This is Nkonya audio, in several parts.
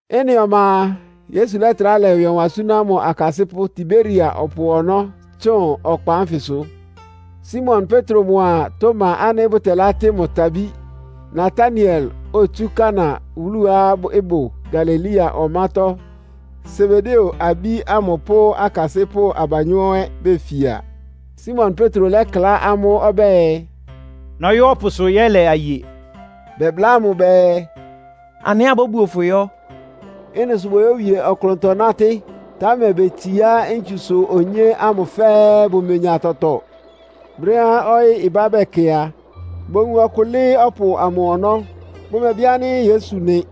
Ɩ́nɩ ɔma a, Yesu lɛ́trá lɛ ɩwɩ ɔwan súná mʋ akasɩ́pʋ́ Tiberia ɔpʋ ɔnɔ́ tsʋn ɔkpa ánfɩsʋ. Simon Petro mʋa Toma ánɩ́ bʋtɛlátɩ́ mʋ Tabí, Nataniel, otsú Kana wúluá ɩbʋ Galilea ɔmátɔ́, Sebedeo abí ámʋ pʋ́ akasɩ́pʋ́ abanyɔ́ ɛ́ befia. Simon Petro lɛ́kla amʋ́ ɔbɛ́ɛ, “Nɔyɔ́ ɔpʋsʋ yɛ́lɛ aye.” Bɛbláa mʋ bɛɛ, “Anɩ ɛ́ abóbuo fʋ yɔ́.” Ɩ́nɩ sʋ boyówie ɔklʋntɔ nátɩ́. Támɛ betsiá ntsusʋ onyé ámʋ fɛ́ɛ́, bʋmenya tɔtɔ. Brɛ́á ɔyɩ́ ɩbá bɛkɛ a, bowun ɔkʋ lɩ́ɩ́ ɔpʋ amʋ ɔnɔ́. Bʋmɛbɩ ánɩ́ Yesu nɩ.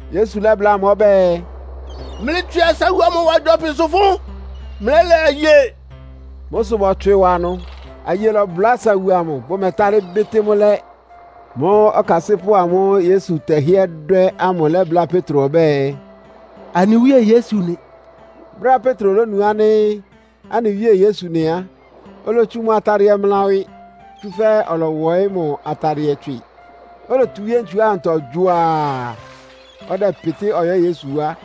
Yesu lɛ́bláa amʋ́ ɔbɛ́ɛ, “Mlɩtswɩ asawu amʋ wa gyɔpɩsʋ fʋ́n, mlɛ́lɛ aye.” Mʋ́ sʋ bɔtswɩ wa ɩnʋ. Aye lɔbʋlá asawu amʋ, bʋmɛtalɩ́ bɩ́tɩ́ mʋ́ lɛ́. Mʋ́ʋ́ ɔkasɩ́pʋ́ amʋ́ʋ́ Yesu tɛhɩɛ́ dwɛ́ ámʋ lɛ́bláa Petro ɔbɛ́ɛ, “Anɩ Wíe Yesu nɩ!” Brɛ́á Petro lónu ánɩ́ anɩ Wíe Yesu nɩ á, olotsu mʋ atadɩɛ mla ɩwɩ. (Tsúfɛ́ ɔlɔwɔɩ́ mʋ atadɩɛ tswɩ), olotu wíé ntsu ámʋtɔ gyuaa, ɔdɛpɩtɩ́ ɔyɔ́ Yesu wá.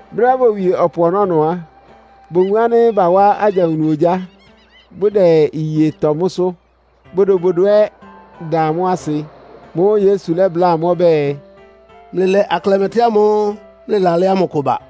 Brɛ́á bowie ɔpʋ ɔnɔ́ á, bowun ánɩ́ bawá agyawunu ogyá, bʋdɛ iye tɔ mʋ́sʋ́, bodobodo ɛ́ da mʋ́ asɩ. Mʋ́ʋ́ Yesu lɛ́bláa amʋ́ ɔbɛ́ɛ, “Mlɩlɛ aklɛmɛtɩ́ ámʋ́ʋ́ mlɩlalɛ́ ámʋ kʋ ba.”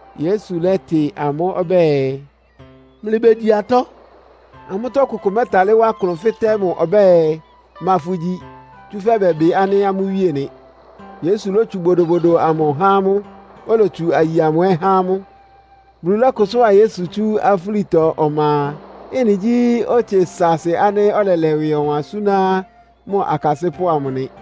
Yesu lɛ́tɩ amʋ́ ɔbɛ́ɛ, “Mlɩbegyi atɔ́.” Amʋ́tɔ́ ɔkʋkʋ mɛ́talɩ́ wá klʋn fɩ́tɛ́ mʋ ɔbɛ́ɛ, “Ma fʋgyi?” Tsúfɛ́ bɛbɩ ánɩ́ amʋ́ Wíe nɩ. Yesu lótsu bodobodo amʋ há amʋ́, olotsu aye amʋ ɛ́ há amʋ́. Bulu lɔ́kʋsʋ́a Yesu tsú afúlitɔ ɔma a, ɩ́nɩ gyí otse saasɩ ánɩ́ ɔlɛlɛ ɩwɩ ɔwan súná mʋ akasɩ́pʋ́ amʋ nɩ.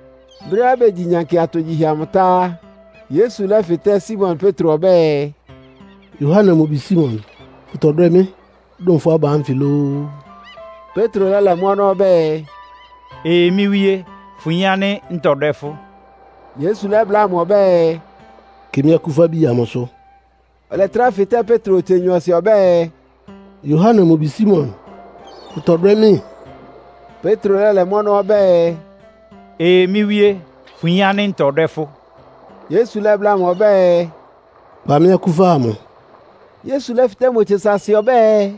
Brɛ́á begyi nyankɩ atogyihɛ amʋ tá á, Yesu lɛ́fɩtɛ́ Simon Petro ɔbɛ́ɛ, “Yohane mʋ bi Simon, fʋtɔdwɛ́ mɩ́ dʋn fʋ́ aba ánfɩ lóó?” Petro lɛ́lɛ mʋ́ ɔnɔ́ ɔbɛ́ɛ, “Ee, mɩ́ Wíé, fʋyin ánɩ́ ntɔdwɛ́ fʋ́.” Yesu lɛ́bláa mʋ ɔbɛ́ɛ, “Kɩ mɩ́ akúfabi amʋsʋ.” Ɔlɛtrá fɩtɛ́ Petro otse nyɔɔsɩ ɔbɛ́ɛ, “Yohane mʋ bi Simon, fʋtɔdwɛ́ mɩ́?” Petro lɛ́lɛ mʋ́ ɔnɔ́ ɔbɛ́ɛ, “Ee, mɩ́ Wíe, fʋyin ánɩ́ ntɔdwɛ́ fʋ́.” Yesu lɛ́bláa mʋ ɔbɛ́ɛ, “Kpa mɩ́ akúfa amʋ.” Yesu lɛ́fɩtɛ́ mʋ otse saasɩ ɔbɛ́ɛ,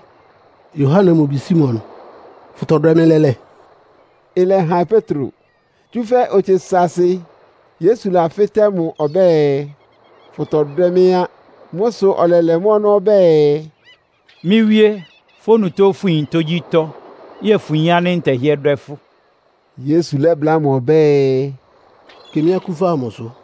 “Yohane mʋ bi Simon, fʋtɔdwɛ́ mɩ́ lɛ́lɛ́?” Ɩlɛhan Petro, tsúfɛ́ otse saasɩ Yesu lafɩ́tɛ́ mʋ ɔbɛ́ɛ, “Fʋtɔdwɛ́ mɩ́?” á. Mʋ́ sʋ ɔlɛlɛ mʋ́ ɔnɔ́ ɔbɛ́ɛ, “Mɩ́ Wíé, fʋ́ onutó fʋyin tógyítɔ́. Yɛ́ɛ fʋyin ánɩ́ ntɛhɩ́ɛ́ dwɛ́ fʋ́!” Yesu lɛ́bláa mʋ ɔbɛ́ɛ, “Kɩ mɩ́ akúfa amʋsʋ.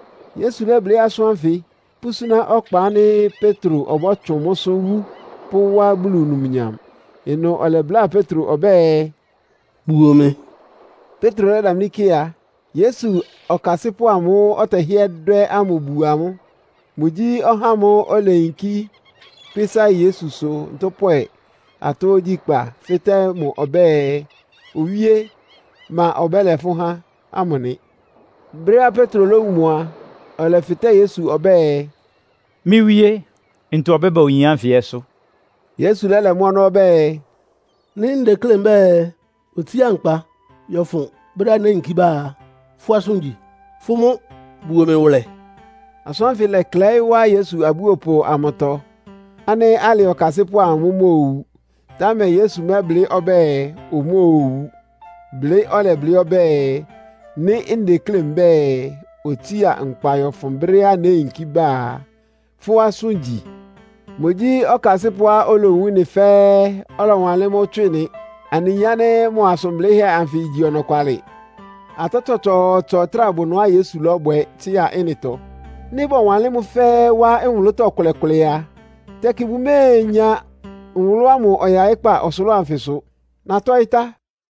(Yesu lɛ́blɩ́ asʋ́n ánfɩ, pʋ́súná ɔkpa ánɩ́ Petro ɔbɔ́tsʋn mʋ́sʋ́ wú pʋ́wá Bulu numnyam.) Ɩnʋ ɔlɛbláa Petro ɔbɛ́ɛ, “Buo mɩ!” Petro lɛ́damlí kɩ a, Yesu ɔkasɩ́pʋ́ amʋ́ʋ́ ɔtɛhɩ́ɛ́ dwɛ́ ámʋ buo amʋ́. (Mʋgyí ɔhá ámʋ́ʋ́ oleyinkí kpɩ́sá Yesusʋ ntʋ́pwɛ atɔ́ ogyíkpá, fɩ́tɛ́ mʋ ɔbɛ́ɛ, “Owíé, ma ɔbɛ́lɛ fʋ́ há?” ámʋ nɩ.) Brɛ́á Petro lówun mʋ a, ɔlɛfɩtɛ́ Yesu ɔbɛ́ɛ, “Mɩ́ Wíé, ntɔ ɔbɛ́ba oyin ánfɩ ɛ́sʋ́?” Yesu lɛ́lɛ mʋ́ ɔnɔ́ ɔbɛ́ɛ, “Nɩ́ ndeklé mbɛ́ɛ otsía nkpa yɔ́fʋn brɛ́á néyinkí ba a, fʋ́ asʋ́n igyi? Fʋ́ mʋ́ buo mɩ wʋlɛ!” Asʋ́n ánfɩ ɩlɛklɛɩ́ wá Yesu abúopʋ amʋtɔ, ánɩ́ alɩ ɔkasɩ́pʋ́ amʋ mʋ́ móowu. Támɛ Yesu mɛ́blɩ́ ɔbɛ́ɛ, omóowu. Blɩ́ ɔlɛblɩ́ ɔbɛ́ɛ, “Nɩ́ ndeklé mbɛ́ɛ, otsía nkpa yɔ́fʋn brɛ́á néyinkí ba a, fʋ́ asʋ́n igyi?” Mʋgyí ɔkasɩ́pʋ́á olowun ɩ́nɩ fɛ́ɛ́, ɔlɔwanlɩ́n mʋ́ tswɩ nɩ. Anɩyin ánɩ́ mʋ asʋn blɩ́hɛ́ anfɩ igyi ɔnɔkwalɩ. Atɔ́ tsɔtsɔɔtsɔ ɩtráa bʋ ɩnʋá Yesu lɔ́bwɛ tsɩ́a ɩ́nɩtɔ. Nɩ́ bɔwanlɩ́n mʋ́ fɛ́ɛ́ wá nwʋlʋ́tɔ́ ɩkʋlɛ-kʋlɛ a, tɛkɩ bʋméenya nwʋlʋ́ ámʋ ɔyaɩ́kpá ɔsʋlʋ́ʋ anfɩsʋ. Natɔ́ɩ́ tá.